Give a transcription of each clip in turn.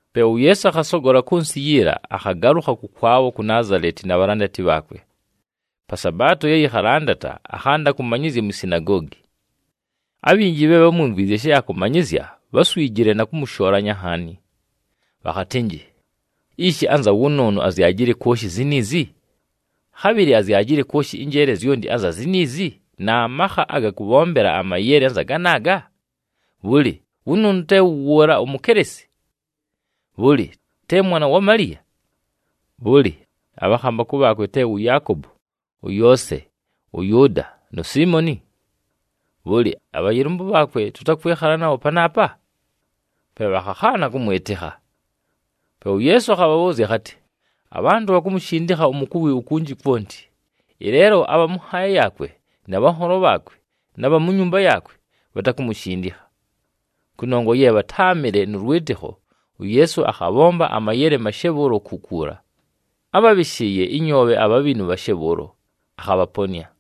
Pe uYeesu akhasogola kʉ nsɨ yiila, akhagalʉkha kʉkwabho ku Naazaleti na bhalandati bhaakwe. Pa Sabaato ye yɨkhalandata, akhanda kʉmanyɨzya mwi sinagoogi. Abhinji bhe bhámwimvwizye she akʉmanyɨzya, bháswijile na kʉmʉshoolanya nhaani. Bhakhatɨnjɨ, “Ishi anza wʉnʉʉnʉ azyajile kwoshi ziniizi? Khabhɨlɨ azyajile kwoshi ɨnjeele zyonti anza ziniizi na makha aga kʉbhombela amayele anza ganaaga? Bhʉlɨ, wʉnʉʉnʉ te wʉ wʉʉla umukelesi? Bhʉlɨ, te mwana wa Maliya? Bhʉlɨ, abhakhambakʉ bhaakwe te wʉ Yaakobo, ʉYoose, ʉYʉʉda nu Siimoni? Bhʉlɨ, abhayɨlʉmbʉ bhaakwe tʉtakwɨkhala nabho panaapa?” Pe bhakhakhaana kʉmwɨtɨkha. Pe uYeesu akhabhabhʉʉzya akhatɨ, “Abhantʉ bhakumushindikha umukuwi ukunji kwonti, ɨleelo abha mʉ nhaaya yaakwe, na bhanholo bhaakwe, na bha mu nyumba yaakwe bhatakumushindikha.” Kʉnongwa ye bhatáamɨle nʉ lwɨtɨkho, uYeesu akhabhomba amayele mashe bhʉʉlo kukuula. Ábhabhɨshɨɨye ɨnyoobhe abhabhinu bhashe bhʉʉlo, akhabhaponɨa.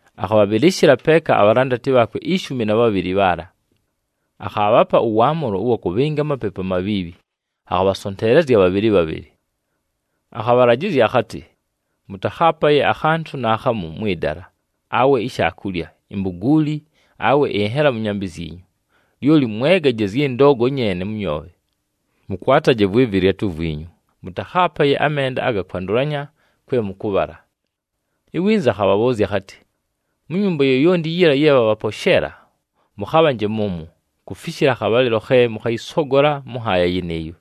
Akhabhabhɨlɨshɨla peeka abhalandati bhaakwe ishumi na bhabhɨlɨ bhaala. Akhaabhapa ʉwaamʉlo ʉwa kʉbhɨnga amapepu amabhiibhi, akhabhasonteelezya bhabhɨlɨ bhabhɨlɨ. Akhabhalajɨzya akhatɨ, “Mʉtakhaapaye akhantʉ naakhamu mwɨ dala, awe ishaakulya, imbuguuli awe ɨnhela mʉ nyambɨ zyinyu, lyoli mwegaje zyɨ ndoogo nyeene mʉ nyoobhe. Mʉkwataje vwɨ vɨlyatʉ vwinyu, mʉtakhaapaye amenda aga kwandʉlanya kwe mʉkʉbhala.” Iwinza akhabhabhʉʉzya akhatɨ, “Mu nyumba yoyonti yiila ye bhabhaposheela, mʉkhabhanje mʉmwo, kufishila akhabhalɨlo khe mʉkhayɨsogola mʉ nhaaya yɨnɨɨyo.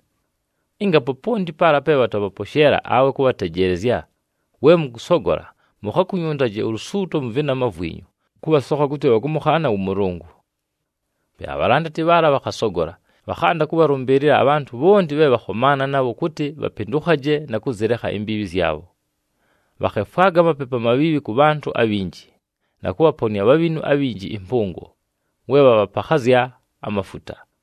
Ɨnga poponti paala pe bhatabhaposheela awe kʉbhatejeelezya, we mʉkʉsogola, mukhakunyuntaje ulusuuto mʉ vɨnama vwinyu, kʉbhasokha kʉtɨ bhakʉmʉkhaana wʉ Mʉlʉngʉ.” Pe abhalandati bhaala bhakhasogola, bhakhanda kʉbhalʉmbɨɨlɨla abhantʉ bhonti bhe bhakhomaana nabho kʉtɨ bhapɨndʉkhaje na kʉzɨlekha imbiibhi zyabho. Bhakhefwaga amapepu amabhiibhi kʉ bhantʉ abhinji, na kʉbhaponɨa abhabhinu abhinji ɨmpʉngo, we bhabhapakhazya amafuta.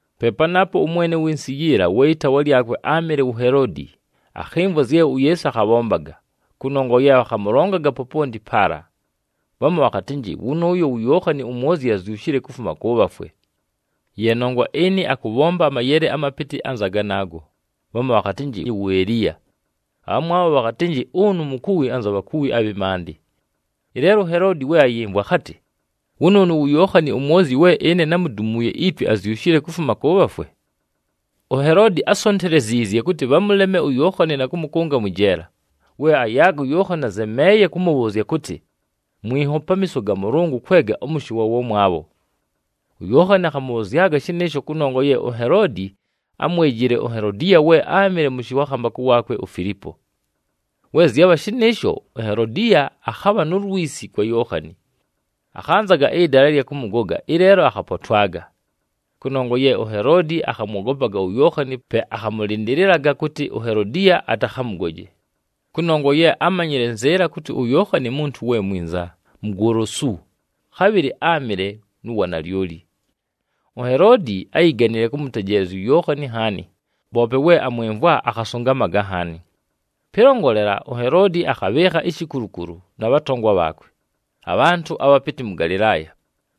Pe panaapo ʉmwene ʉwɨ nsɨ yiila, we ɨtaawa lyakwe áamɨle wu Heloodi, akhɨmvwa zye uYeesu akhabhombaga, kʉnongwa ye bhakhamʉlongaga poponti paala. Bhamu bhakhatɨnjɨ, “Wʉnʉʉyo wu Yookhani uMwozyi azyushile kufuma kʉ bhafwe. Ye nongwa ɨnɨ akʉbhomba amayele amapɨtɨ anza ganaago.” Bhamu bhakhatɨnjɨ, “Wu Eliya.” Abhamwabho bhakhatɨnjɨ, “Ʉnʉ mukuwi anza bhakuwi abhɨ maandɨ.” Ɨleelo uHeloodi we ayɨmvwa, akhatɨ, “Wʉnʉʉnʉ wu Yookhani uMwozyi we ɨne námudumuuye itwe, azyushile kufuma kʉ bhafwe!” UHeloodi ásonteleziizye kʉtɨ bhamʉleme uYookhani na kʉmʉkʉnga mwɨ jeela, we ayaaga uYookhani azemeeye kʉmʉbhʉʉzya kʉtɨ, “Mwinho pamiiso ga Mʉlʉngʉ kwega ʉmʉshɨ wa wamwabho.” UYookhani akhamʉbhʉzyaga shɨnɨɨsho kʉnongwa ye uHeloodi ámwejile uHelodiya we áamɨle mʉshɨ wa khambakʉ waakwe uFilipo. We zyabha shɨnɨɨsho, uHelodiya akhabha nu lwisi kwa Yookhani. Akhanzaga ɨdala ɨlya kʉmʉgoga, ɨleelo akhapotwaga. Kʉnongwa ye uHeloodi akhamwogopaga uYookhani, pe akhamʉlɨndɨlɨlaga kʉtɨ uHelodiya atakhamʉgoje, kʉnongwa ye ámanyile nzɨɨla kʉtɨ uYookhani muntu we mwinza, mugolosu, khabhɨlɨ áamɨle nu wanalyoli. UHeloodi áyiganile kʉmʉtejeelezya uYookhani nhaani, poope we amwɨmvwa, akhasʉngamaga nhaani. Pɨlongolela, uHeloodi akhabhɨɨkha ishikulukulu na bhatongwa bhaakwe, abhantʉ abhapɨtɨ mʉ Galɨlaaya,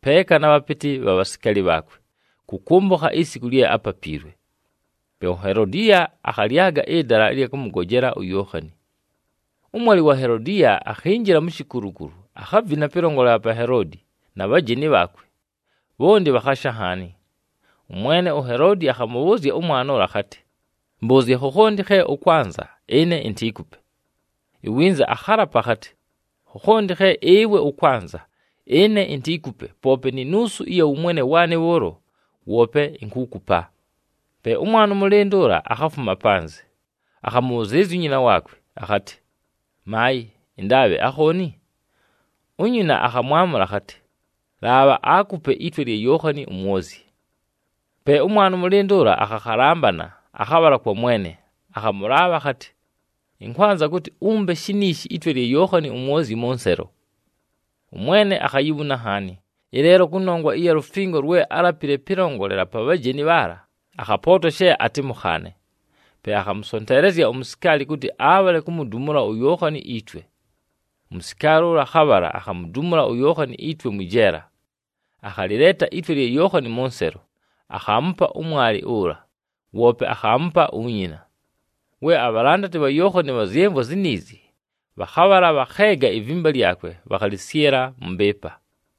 peeka na bhapɨtɨ bha bhasikaali bhaakwe kʉkʉmbʉkha isiku lye ápapiilwe. Pe uHelodiya akhalyaga ɨdala ɨlya kʉmʉgojela uYookhani. Ʉmwalɨ wa Helodiya akhinjila mu shikulukulu, akhavina pɨlongolela pa Heloodi na bhajeni bhaakwe, bhonti bhakhasha nhaani. Ʉmwene uHeloodi akhamʉbhʉʉzya ʉmwana ʉla akhatɨ, “Mbʉʉzye khokhonti khe ʉkwanza, ɨne intiikupe.” Iwinza akhalapa akhatɨ, “Khokhonti khe ɨwe ʉkwanza, ɨne intiikupe, poope ni nuusu ɨya wʉmwene waanɨ bhʉʉlo, woope inkuukupa.” Pe ʉmwana ʉmʉlɨndʉ ʉla akhafuma panzɨ, akhamʉbhʉzɨɨlɨzya unyina akhatɨ, “Maayɨ, ɨndaabhe akhooni?” Unyina akhamwamʉla akhatɨ, “Laabha aakupe itwe lya Yookhani uMwozyi.” Pe ʉmwana ʉmʉlɨndʉ ʉla akhakhalambana, akhabhala kwa mwene, akhamʉlaabha akhatɨ, “Ɨnkwanza kʉtɨ umpe shiniishi itwe lya Yookhani uMwozyi mʉ nselo.” ɄMwene akhayibhuna nhaani, ɨleelo kʉnongwa ɨya lufingo lwe álapile pɨlongolela pa bhajeni bhaala, akhapootwa she atɨmʉkhaane. Pe akhamʉsonteelezya umusikaali kʉtɨ abhale kumudumula uYookhani itwe. Umusikaali ʉla akhabhala, akhamudumula uYookhani itwe mwɨ jeela. Akhalɨleeta itwe lya Yookhani mʉ nselo, akhaamupa ʉmwalɨ ʉla, woope akhaamupa unyina. We abhalandati bha Yookhani bhazyɨmvwa ziniizi, bhakhabhala, bhakheega ivimba lyakwe, bhakhalɨsyɨla mʉ mbɨɨpa.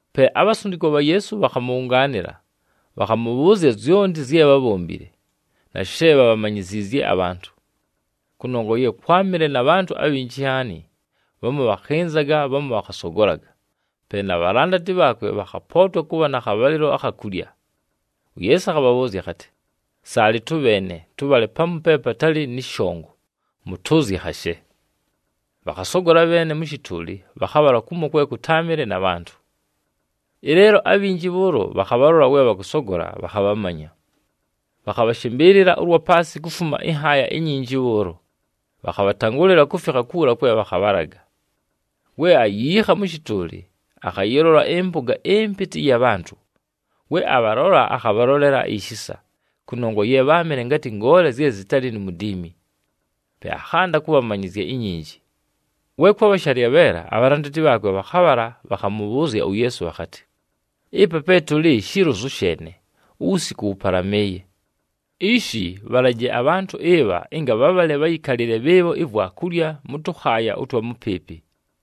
Pe abhasundikwa bha Yeesu bhakhamʉbhʉngaanɨla, bhakhamʉbhʉʉzya zyonti zye bhábhombile, na she bhabhamanyiziizye abhantʉ. Kʉnongwa ye kwámɨle na bhantʉ abhinji nhaani, bhamu bhakhɨnzaga, bhamu bhakhasogolaga, pe na bhalandati bhaakwe bhakhapootwa kʉbha na khabhalɨlo akha kulya. UYeesu akhabhabhʉʉzya akhatɨ, “Saalɨ tʉbheene, tʉbhale pamu pe patalɨ nɨ shongo, mʉtʉʉzye khashe.” Bhakhasogola bheene mʉ shɨtʉʉlɨ, bhakhabhala kumo kwe kʉtáamɨle na bhantʉ. Ɨleelo abhinji bhʉʉlo bhakhabhalola we bhakʉsogola, bhakhabhamanya. Bhakhabhashɨmbɨɨlɨla ʉlwa paasɨ kufuma ɨnhaaya inyinji bhʉʉlo, bhakhabhatangʉlɨla kufikha kuula kwe bhakhabhalaga. We ayiikha mʉ shɨtʉʉlɨ, akhayɨlola ɨmpʉga ɨmpɨtɨ ɨya bhantʉ. We abhalola, akhabhalolela ishisa, kʉnongwa ye bháamɨle ngatɨ ngoole zye zɨtalɨ nu mudiimi. Pe akhanda kʉbhamanyɨzya inyinji. We kwabha shalyabheela, abhalandati bhaakwe bhakhabhala bhakhamʉbhʉʉzya uYeesu bhakhatɨ, “Ɨpa pe tʉlɨ shilozu sheene, uwusiku wʉpalamɨɨye. Ishi, bhalaje abhantʉ ɨbha ɨnga bhabhale bhayɨkalɨle bhɨɨbho ivwakulya mʉ tʉkhaaya ʉtwa mʉpɨɨpɨ.”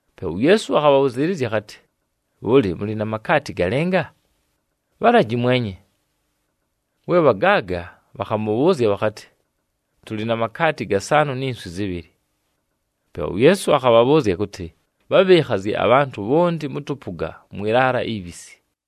Pe uYeesu akhabhabhʉzɨɨlɨzya akhatɨ, “Bhʉlɨ, mʉlɨ na makaati galɨnga? Bhalaji mwenye.” We bhagaaga, bhakhamʉbhʉʉzya bhakhatɨ, “Tʉlɨ na makaati gasaanʉ ni nswi zɨbhɨlɨ.” Pe uYeesu akhabhabhʉʉzya kʉtɨ, bhabhɨɨkhazye abhantʉ bhonti mʉ tʉpʉga mwɨ laala ibhisi.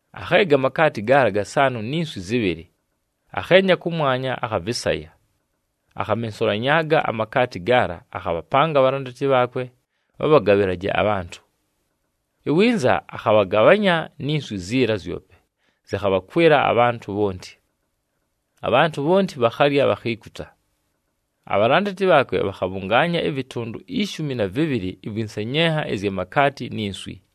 Akheega amakaati gaala gasaanʉ ni nswi zɨbhɨlɨ, akheenya kʉmwanya, akhavɨsaya. Akhamensulanyaaga amakaati gaala, akhabhapanga abhalandati bhaakwe bhabhagabhɨlaje abhantʉ. Iwinza akhabhagabhanya ni nswi ziila zyope zɨkhabhakwɨla abhantʉ bhonti. Abhantʉ bhonti bhakhalya, bhakhiikuta. Abhalandati bhaakwe bhakhabhʉngaanya ɨvɨtʉndʉ ishumi na vɨbhɨlɨ ɨvwɨ nsenyenha ɨzya makaati ni nswi.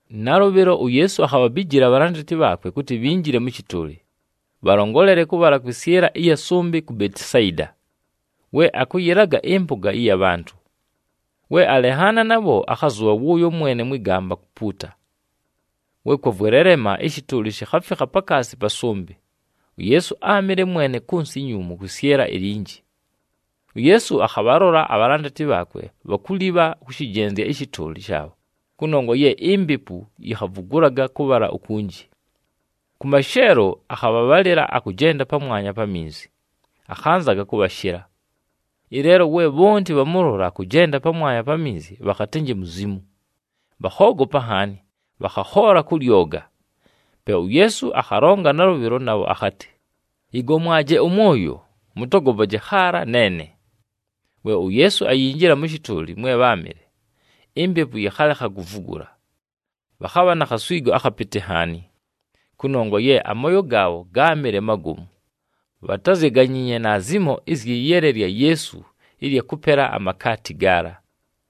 Nalʉbhɨlo, uYeesu akhabhabijila abhalandati bhaakwe kʉtɨ bhinjile mʉ shɨtʉʉlɨ, bhalongolele kʉbhala kwɨsyɨla ɨya sʉmbɨ ku Betisayida, we akʉyɨlaga ɨmpʉga ɨya bhantʉ. We alenhaana nabho, akhazʉbha wʉʉyo mwene mwɨ gamba kupuuta. We kwavwelelema, ɨshɨtʉʉlɨ shikhafikha pakaasi pa sʉmbɨ, uYeesu áamɨle mwene kʉ nsɨ inyuumu kwɨsyɨla ilinji. UYeesu akhabhalola abhalandati bhaakwe bhakulibha kʉshɨjenzya ɨshɨtʉʉlɨ shaabho kʉnongwa ye impepu yikhavugulaga kʉbhala ukunji. Kʉ masheelo, akhabhabhalɨla akʉjenda pamwanya pa minzi, akhanzaga kʉbhashɨla. Ɨleelo we bhonti bhamʉlola akʉjenda pamwanya pa minzi bhakhatɨnjɨ muzimu, bhakhoogopa nhaani, bhakhakhoola kʉ lyoga. Pe uYeesu akhalonga nalʉbhɨlo nabho akhatɨ, “Yɨgomwaje ʉmwoyo, mʉtogopaje khaala, neene!” We uYeesu ayinjila mʉ shɨtʉʉlɨ mwe bháamɨle, impepu yɨkhalekha kuvugula. Bhakhabha na khaswigo akhapɨtɨ nhaani, kʉnongwa ye amooyo gaabho gáamɨle magomu, bhatázyaganyiinye naazimo ɨzyɨ yele lya Yeesu ɨlya kʉpela amakaati gaala.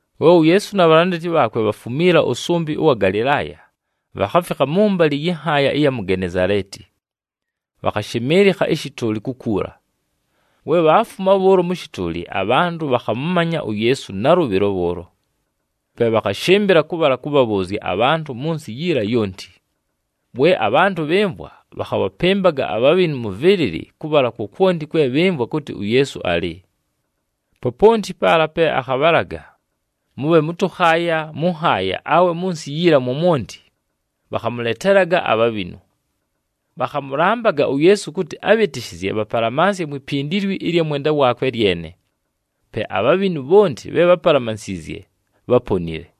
We uYeesu na bhalandati bhaakwe bhafumiila ʉsʉmbɨ ʉwa Galɨlaaya, bhakhafikha mʉmbalɨ yɨ nhaaya ɨya mu Genezaleeti, bhakhashɨmɨɨlɨkha ɨshɨtʉʉlɨ kukuula. We bhaafuma bhʉʉlo mʉ shɨtʉʉlɨ, abhantʉ bhakhamʉmanya uYeesu nalʉbhɨlo bhʉʉlo. Pe bhakhashɨmbɨla kʉbhala kʉbhabhʉʉzya abhantʉ mʉ nsɨ yiila yonti. We abhantʉ bhɨmvwa, bhakhabhapɨmbaga abhabhinu mʉ vɨlɨlɨ kʉbhala kwokwonti kwe bhɨmvwa kʉtɨ uYeesu alɨ. Poponti paala pe akhabhalaga, mʉbhe mʉ tʉkhaaya, mʉ nhaaya awe mʉ nsɨ yiila mwomwonti, bhakhamʉletelaga abhabhinu. Bhakhamʉlambaga uYeesu kʉtɨ abhɨtɨshɨzye bhapalamansye mwi pindilwi ɨlya mwenda waakwe lyene. Pe abhabhinu bhonti bhe bhápalamansiizye, bháponile.